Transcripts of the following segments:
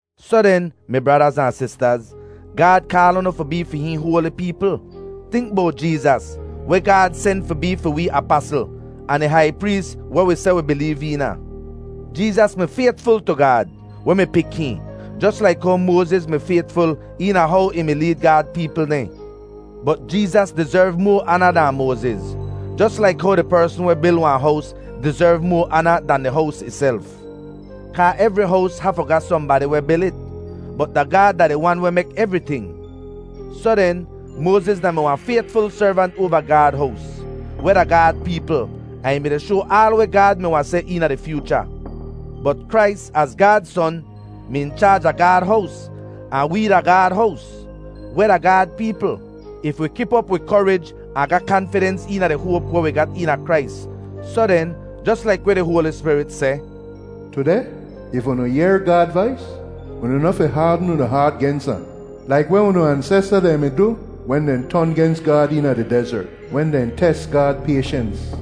Soh den, mi bradaz ahn sistaz, Gaad kaal unu fi bee fi hihn hoali peepl. Tink bowt Jeezas, weh Gaad sen fi bee fi wee apasl ahn di hai prees weh wi seh wi bileev eena. Jeezas mi faytful tu Gaad, weh mi pik hihn, jos laik how Moaziz mi faytful eena how ih mi leed Gaad peepl dehn. Bot Jeezas dizerv moa aana dahn Moaziz, jos laik how di persn weh bil wahn hows dizerv moa aana dan di hows ihself. Kaa evri hows hafu ga sohnbadi weh bil it, bot da Gaad da di Wan weh mek evriting. Soh den, Moaziz da-mi wahn faytful servant oava Gaad hows, weh da Gaad peepl, ahn ih mi-di shoa aal weh Gaad mi wahn seh eena di fyoocha. Bot Krais, az Gaad Son, mi in chaaj a Gaad hows. Ahn wee da Gaad hows, weh da Gaad peepl, if wi kip op wi korij ahn ga kanfidens eena di hoap weh wi ga eena Krais. Soh den, jos laik weh di Hoali Spirit seh, “Tudeh, if unu yehr Gaad vais, unu noh fi haadn unu haat gens ahn, laik weh unu ansesta dehn mi du wen dehn ton gens Gaad eena di dezert, wen dehn tes Gaad payshens.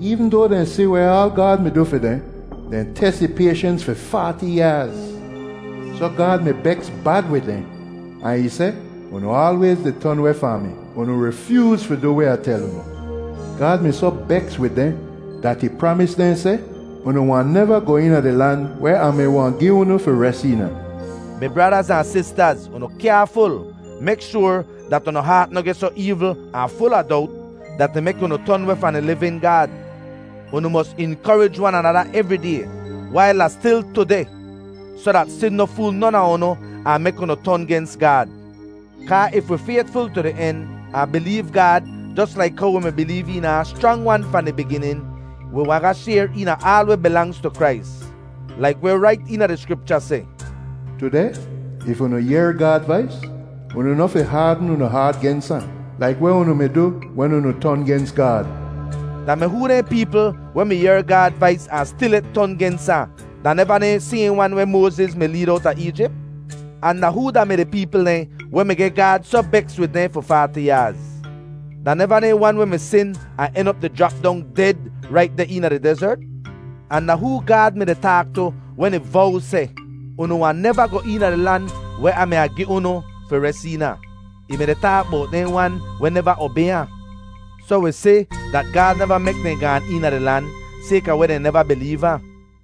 Eevn doa dehn si weh aal Gaad mi du fi dehn, dehn tes ih payshens fi faati yaaz. Soh Gaad mi beks bad wid dehn ahn ih seh, ‘Unu aalwayz di ton weh fahn mi. Unu rifyooz fi du weh Ah tel unu.’ Gaad mi soh beks wid dehn dat ih pramis dehn seh, ‘Unu wahn neva goh eena di lan weh Ah mi wahn gi unu fi res eena!’” Mi bradaz ahn sistaz, unu kyaaful! Mek shoar dat unu haat noh geh soh eevl ahn ful a dowt, dat ih mek unu ton weh fahn di livin Gaad. Unu mos inkorij wan anada evri day, wail da stil “tudeh” soh dat sin noh fool non a unu ahn mek unu ton gens Gaad. Kaa if wi faytful tu di en, ahn bileev Gaad jos laik how wi mi bileev eena ahn schrang-wan fahn di biginin, wi wahn ga shayr eena aal weh bilangz tu Krais. Laik weh rait eena di Skripcha seh, “Tudeh, if unu yehr Gaad vais, unu noh fi haadn unu haat gens ahn, laik weh unu mi du wen unu ton gens Gaad.” Da mi hoo dehn peepl weh mi yehr Gaad vais ahn stilyet ton gens ahn? Da neva dehn sayhn wan weh Moaziz mi leed owta Eejip? Ahn da hoo da-mi di peepl dehn weh mi geh Gaad soh beks wid dehn fi faati yaaz? Da neva dehn wan weh mi sin ahn en op di jrap dong ded rait deh eena di dezert? Ahn da hoo Gaad mi-di taak tu wen ih vow seh, “Unu wahn neva goh eena di lan weh Ah mi wahn gi unu fi res eena”? Ih mi-di taak bowt dehn wan weh neva obay ahn. Soh wi si dat Gaad neva mek dehn gaan eena di lan, sayka weh dehn neva bileev ahn.